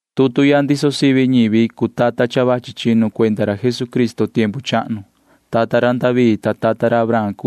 Tutu ya ndiso sivi ñivi cuu tata cha vachi chinu ra Jesucristo tiempu chahnu. Ñivi ra chi ra David, ta ñivi ra chi ra Abraham.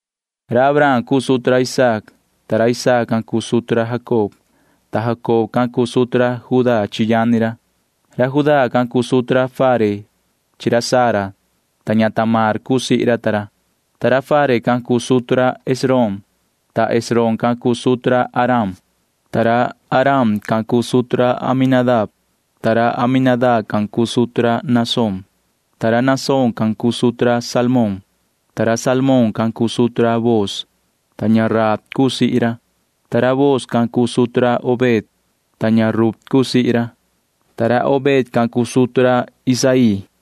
Abraham cuu sutu ra Isaac, ta Isaac can cuu sutu ra Jacob. Jacob can cuu sutu ra Judá chi yani ra. Judá can cuu sutu ra Fare chi ra Zara, ta Tamar cuu sihi ra ta ra. Fare can cuu sutu ra Esrom, ta Esrom can cuu sutu ra Aram. Aram can cuu sutu ra Aminadab, ta Aminadab can cuu sutu ra Naasón. Naasón can cuu sutu ra Salmón, ta Salmón can cuu sutu ra Booz, ta Rahab cuu sihi ra. Booz can cuu sutu ra Obed, ta Rut cuu sihi ra. Obed can cuu sutu ra Isaí,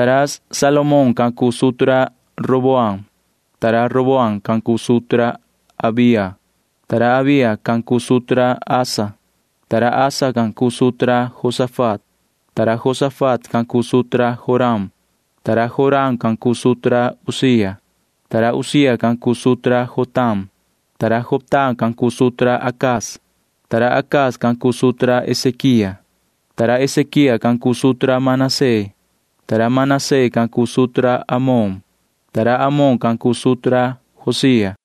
Salomón can cuu sutu ra Roboam, ta Roboam can cuu sutu ra Abía. Abía can cuu sutu ra Asa, ta Asa can cuu sutu ra Josafat. Josafat can cuu sutu ra Joram, ta Joram can cuu sutu ra Uzía. Uzía can cuu sutu ra Jotam, ta Jotam can cuu sutu ra Acaz. Acaz can cuu sutu ra Ezequía, ta Ezequía can cuu sutu ra Manasee. Manasee can cuu sutu ra Amón, ta Amón can cuu sutu ra Josía.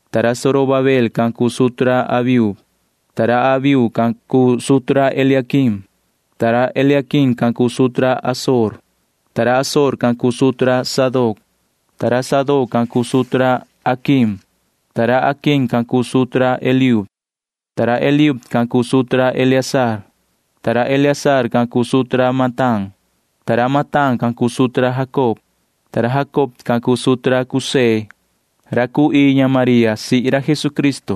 ta Zorobabel can cuu sutu ra Abiud. Abiud can cuu sutu ra Eliaquim, ta Eliaquim can cuu sutu ra Azor. Azor can cuu sutu ra Sadoc, ta Sadoc can cuu sutu ra Aquim. Aquim can cuu sutu ra Eliud, ta Eliud can cuu sutu ra Eleazar. Eleazar can cuu sutu ra Matán, ta Matán can cuu sutu ra Jacob. Jacob can cuu sutu ra José ra cuu ii ña María sihi ra Jesucristo.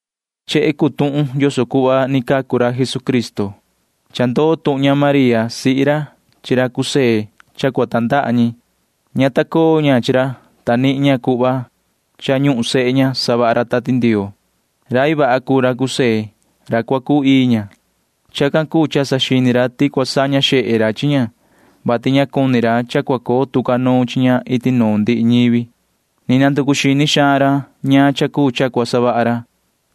Chehe cuu tuhun yoso cuhva ni cacu ra Jesucristo. Cha iyo vaha tuhun cha cua tandaha ña María sihi ra chi ra José. Ña ta coo ña chi ra, ta nihin ña cuhva ti cha cua coo sehe ña savaha ra Tati Ndioo. Rai vaha cuu ra José ra cua cuu ii ña. Chacan cuu cha saxini ra ti cua saña xehe ra chi ña, vati ña cuni ra cha cua coo tu ca nuun chi ña iti nuun ndihi ñivi. Ni vii nanducu xini ra ñaan cha cuu cha cua savaha ra,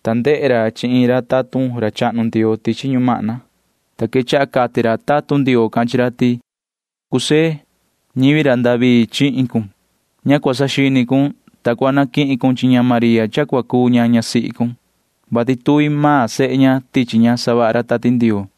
ta ndehe ra chi iin tatun ra chahnu Ndioo tichi ñumahna, ta quechaha cati ra tatun Ndioo can chi ra ti: ―Yoho José, ñivi ra David chihin cun. Ña cua saxini cun, soco cua naquihin cun chi ña María ñasihi cun, vati tuvi maan sehe ña tichi ña savaha ra Tati Ndioo.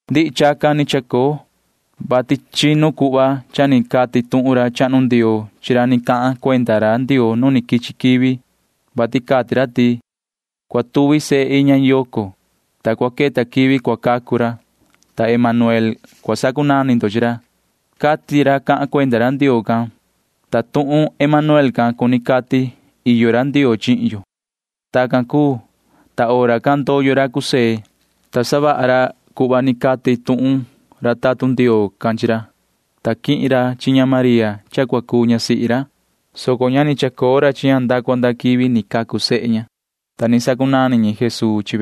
Ndihi chacan ni chacoo, vati tacan ni quee tuhun cuhva ni cati tuhun ra chahnu Ndioo chi ra ni cahan cuenda ra Ndioo nu ni quichi quivi, vati cha cati ra ti: Cua tuvi sehe iin ña yoco, ta cua queta quivi cua cacu ra. Emanuel cua cunani ra, cati ra cahan cuenda ra Ndioo can. Cuni cati tuhun Emanuel can ti iyo ra Ndioo chihin yo. Tacan cuu, ta hora can ndoyo ra José, ta savaha ra cuhva cati tuhun tatun ra chahnu Ndioo. Quihin ra chi ñasihi ra, soco ña ni chacoo ra chi ña nda cua nda quivi ni cacu sehe ña. Tacan cuu, ta chacunani ra Jesuu.